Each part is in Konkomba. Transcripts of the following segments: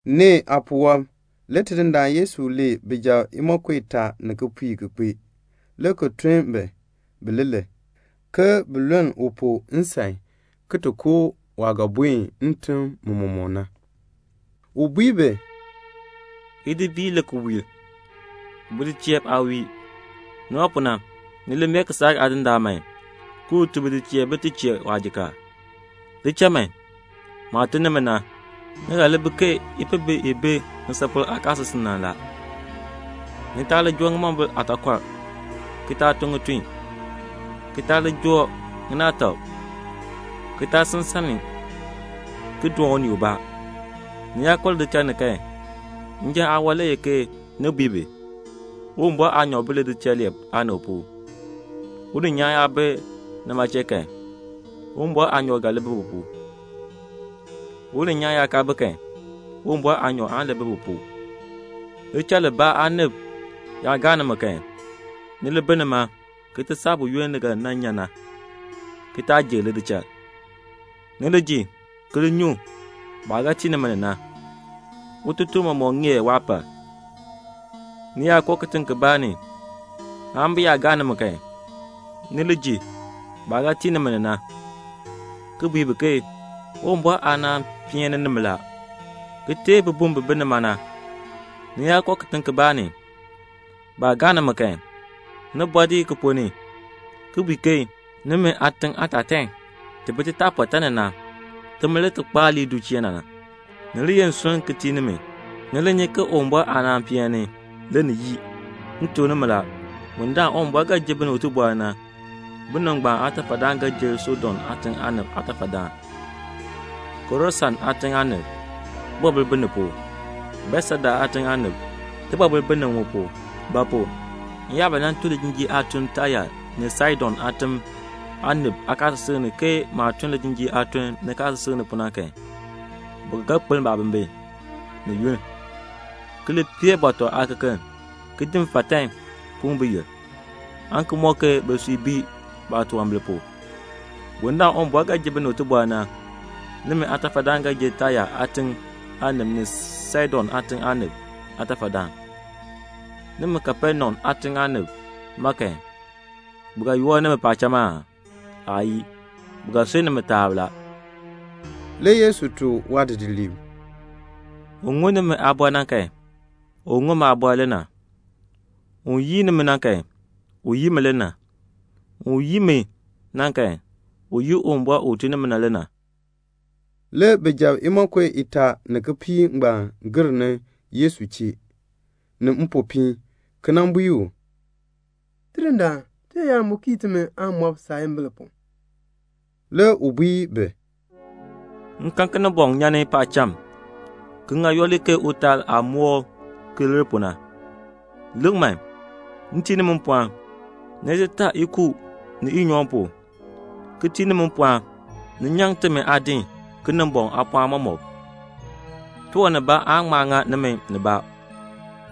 Nee aapuwɔb le Tidindaan Yesu lee bijab imonko itaa ni kipiik ki kpee, le ki tun bi, bileelee, ke bin luln u pu nsan, ki ti koo waah ga buen ntim mɔmɔk ni na. U bui bi, "Idi biir la ki wiir. Bidicheeliib aa wiir. Nima pu na, ni li mee kisaak aadindaan man ke un tun bidicheeliib bin ti chee waajikaar. Li cha man. Maah tun nimi na, ni ga li bi ke ipihbi i bi ŋisapol aakaasisik ni na la. Ni taa li joo ŋimombil aataakɔr, ki taa tun ŋitun, ki taa li joo ŋinaatak, ki taa sil nsan ni ki doon unii ubaa. Ni yaa koo lidichal ni kan, njan le ye ni bui bi, 'Uwumbɔr aanyoor bi lidichal lee aanib pu.' Uninyaan yaa bi nima chee kan, Uwumbɔr aanyoor ga li bi u pu. Uninyaan yaa kaa bi kan, Uwumbɔr aanyoor aan li bi bi pu. Lidichal libaa aanib yaa gaa nimi kan, ni li bi nima ki ti saa buyoonn ni ga nan nyan na, ki taa jir lidichal. Ni li ji ki li nyu baah ga tii nimi ni na; ututuln mɔmɔk ŋeer waapal. Ni yaa koo kitiŋ kibaa ni kan, bi yaa gaa nimi kan, ni li ji baah ga tii nimi ni na, ki bui bi ke 'Uwumbɔr aanaan peen ni nimi la,' ki teei bibum bi bi nima na. Ni yaa koo kitiŋ kibaa ni, baa gaa nimi kan, ni bɔɔ dii ki ponn ni ki bui ke, 'Nimi aatiŋ aatatan ni bi titaapɔtaa ni na, muma le ti kpaar lii du chee na, ni li ye nsurm ki tii nimi. Ni li nyi man, Uwumbɔr aanaan peen ni, le ni yii.' M tuk nimi la, bundaln Uwumbɔr ga ji binib tibɔr na, binib ngbaan aatafadaan ga li jer Sodom aatiŋ aanib aatafadaan." "Korasin aatiŋ aanib, tibɔbil bi ni pu. Betseda aatiŋ aanib, tibɔbil bi ni mu pu; ba pu? m yaa ba nan tun lijinjiir aatun Taya ni Saidon aatim aanib aakaasisik ni ke maah tun lijinjiir aatun nikaasisik ni pu na kan, bi ba ga kpeln baabimbin ni yunn, ki li pee bɔtɔ aakekeln ki di mfatan puŋ biyil pu, aan ki mɔk ke bisui bii baatunwambir pu. Bundaln Uwumbɔr ga ji binib tibɔr na, nimi aatafadaan ga li jer Taya aatiŋ aanib ni Saidon aatiŋ aanib aatafadaan. Nimi Kapenaum aatiŋ aanib ma kan, bi ga yoor nimi paacham aa? Aayii. Bi ga sunn nimi taab la." Le Yesu tuk waadidiliib, "Un ŋun nimi aaliin na kan, u ŋun maaliin le na. Un yii nimi na kan, u yii mi le na. Un yii mi na kan, u yii Uwumbɔr u tun ni mi na le na." Le bijab imonko itaa ni kipiik ngbaan gir ni Yesu chee ni mpopiin, ki bui u, "Tidindaan, tiyaayar mu kii timi aamɔb saayimbil pu." Le u bui bi, "M kan Kinimbɔŋ nyan ni paacham ki ŋa yooli ke utaal aah moor ki lir pu na. Lik man, m tii nimi mpɔɔn, ni ti taa ikuub ni inyoohn pu, ki tii nimi mpɔɔn, ni nyaŋ timi aadin Kinimbɔŋ aapɔɔn mɔmɔk. Tiwan nibaa aan ŋma ŋa nimi nibaa.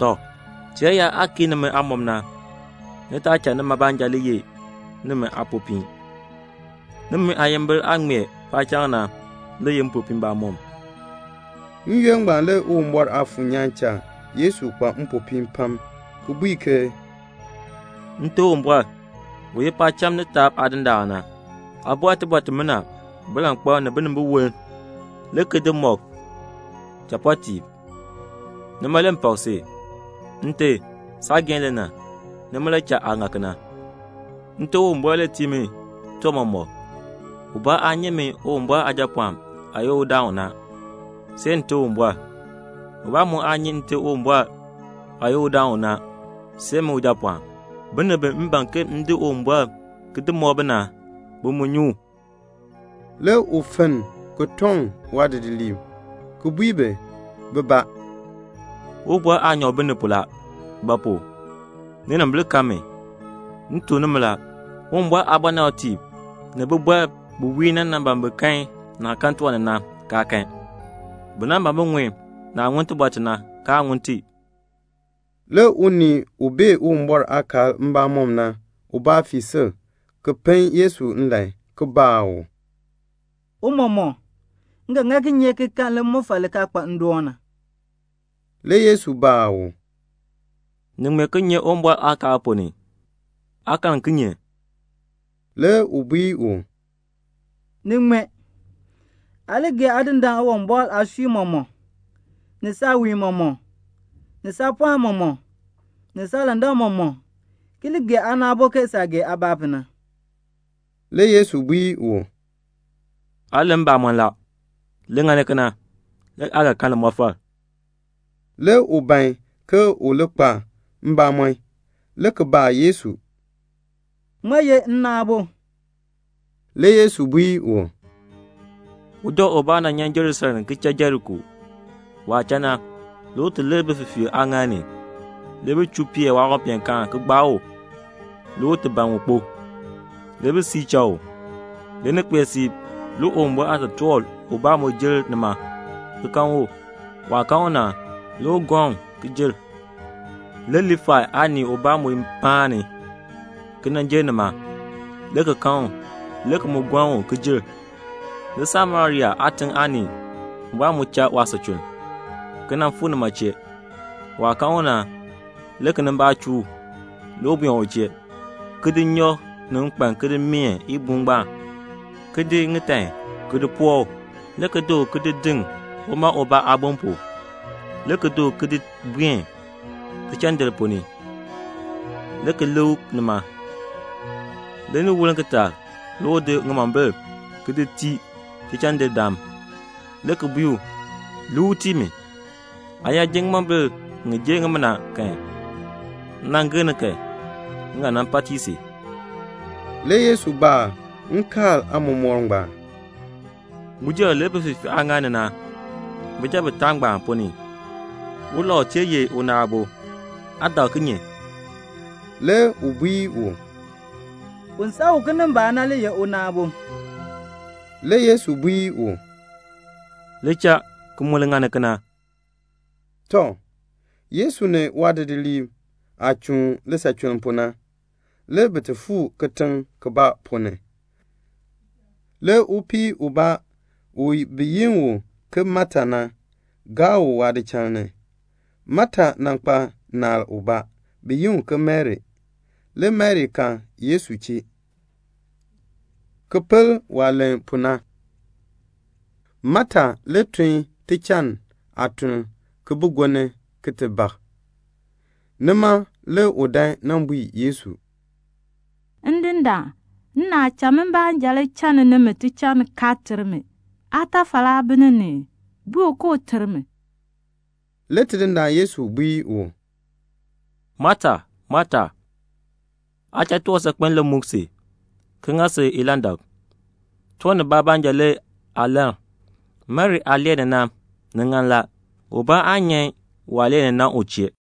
Tɔ, tiyaayar aah kii nimi aamɔb na, ni taa cha nima baanja le li ye nimi aapopiin. Nimi aayimbil aah ŋmee paacham na le ye mpopiin mbamɔm." N-yoonn ngbaan le Uwumbɔr Aafuur nyaan cha Yesu kpa mpopiin pam, ki bui ke "Nte Uwumbɔr, u ye paacham ni taab Aadindaan na, aa bɔr tibɔr timina bilankpalb ni binimbiwolm, le ki di mɔk chapɔɔtiib, nima le m pak si. Nte, saageehn le na, nima le cha aa ŋa kena. "Nte Uwumbɔr le tii mi tiwan mɔmɔk. Ubaa aa nyi min Uwumbɔr Aajapɔɔn aah ye udaan u na, see Nte Uwumbɔr. Ubaa mu aa nyi Nte Uwumbɔr aah ye udaan u na, see min Ujapɔɔn. Binib bi m ban ke m di Uwumbɔr ki di mɔk bi na, bi mu nyi u." Le u fenn ki toŋ waadidiliib, ki bui bi bibaa, "Uwumbɔr aanyoor bi ni pu la; ba pu? ninimbil kan min. M tuk nimi la, Uwumbɔr aabɔnabtiib ni bibɔrb bi wiir na nan ban bin kan naah kan tiwan ni na, kaa kan. Bi nan ban bin ŋun naah ŋun tibɔr ti na, kaa ŋun ti." Le unii u bee Uwumbɔr aakaal mbamɔm na ubaa fii sil ki pen Yesu nlan, ki baa u, "Tiicha, m ga ŋa kinye ki kan limɔfal li kaa kpa ndoon na?" Le Yesu baa u, "Ni ŋmee kinye Uwumbɔr aakaal ponn ni? Aa karn kinye?" Le u bui u, "Ni ŋmee, 'Aa li gee Aadindaan Uwumbɔr aasui mɔmɔk, ni saawiin mɔmɔk, ni saapɔɔn mɔmɔk, ni saalandak mɔmɔk, ki li gee aana aabo ke saah gee aabaa pu na."' Le Yesu bui u, "Aa len mbamɔn la. Li ŋani kena, le aa ga kan limɔfal." Le u ban ke u li kpa mbamɔn, le ki baa Yesu, "Ŋmaa ye nna aabo?" Le Yesu bui u, "Uja ubaa nan nyan Jerusalem ki cha Jeriko. Waah cha na, le u lir bififiirb aaŋaal ni. Le bi chuu peer waawanpeenkaan ki gbaa u, le u ti ban un kpo. Le bi siir cha u. Le ni kpee siib, le Uwumbɔr aatotoor ubaa mu jer nima, ki kan u. Waah kan u na, le u gɔln u ki jer. Le Liifai aanii ubaa mu paan ni, ki nan jer nima, le ki kan u. Le u mu gɔln u ki jer. Le Samaria aatiŋ aanii ubaa mu cha waasachuln, ki nan fuu nima chee. Waah kan u na, le kinimbaak chuu u. Le u buen u chee, ki di nnyɔk ni nkpan ki di meen ibuun ngbaan, ki di ŋitan ki di poo u, le ki di u ki di diŋ uma ubaa aabon pu, le ki di u ki di buen tichaandir ponn ni, le ki lik u nima. Le ni woln kitaak le u di ŋimombil ki di tii tichaandirdaan, le ki bui u, 'Lik u tii mi. Aa yaa ji ŋimombil ŋi jer ŋimina kan, m nan gir ni kan, m ga nan pa tii si."' Le Yesu baa nkaal aamɔmɔkr ngbaan, "Uja u lir bififiirb aaŋaal ni na, bijab bitaa ngbaan ponn ni, ulau tee ye una aabo? Aa dak kinye?" Le u bui u, "Un san u kinimbaak na le ye una aabo." Le Yesu bui u, "Li cha ki mu li ŋani kena." Tɔ, Yesu ni waadidiliib aah chuun lisachuln pu na, le bi fuu kitiŋ kibaa ponn ni. Le upii ubaa bi yi u ke Mata, gaa u waadichal ni. Mata kpa naal ubaa, bi yi u ke Mari. Le Mari kal Yesu chee, le ki pel waah len pu na. Mata le tun tichaan aatuln ki bi gonni ki ti bak. Nima le u dan nan bui Yesu, "Ndindaan, nnaal cha mi baanja channi nimi tichann kaa ter mi. Aatafal aa bi ni ni ii? Bui u ke un ter mi." Le Tidindaan Yesu bui u, "Mata, Mata, aa cha tiwan saakpen le muk si ki ŋa si ilandak. Tiwan nibaa baanja le aa lann. Mari aah lee ni na, ni ŋan la. Ubaa aan nyan waah lee ni na u chee."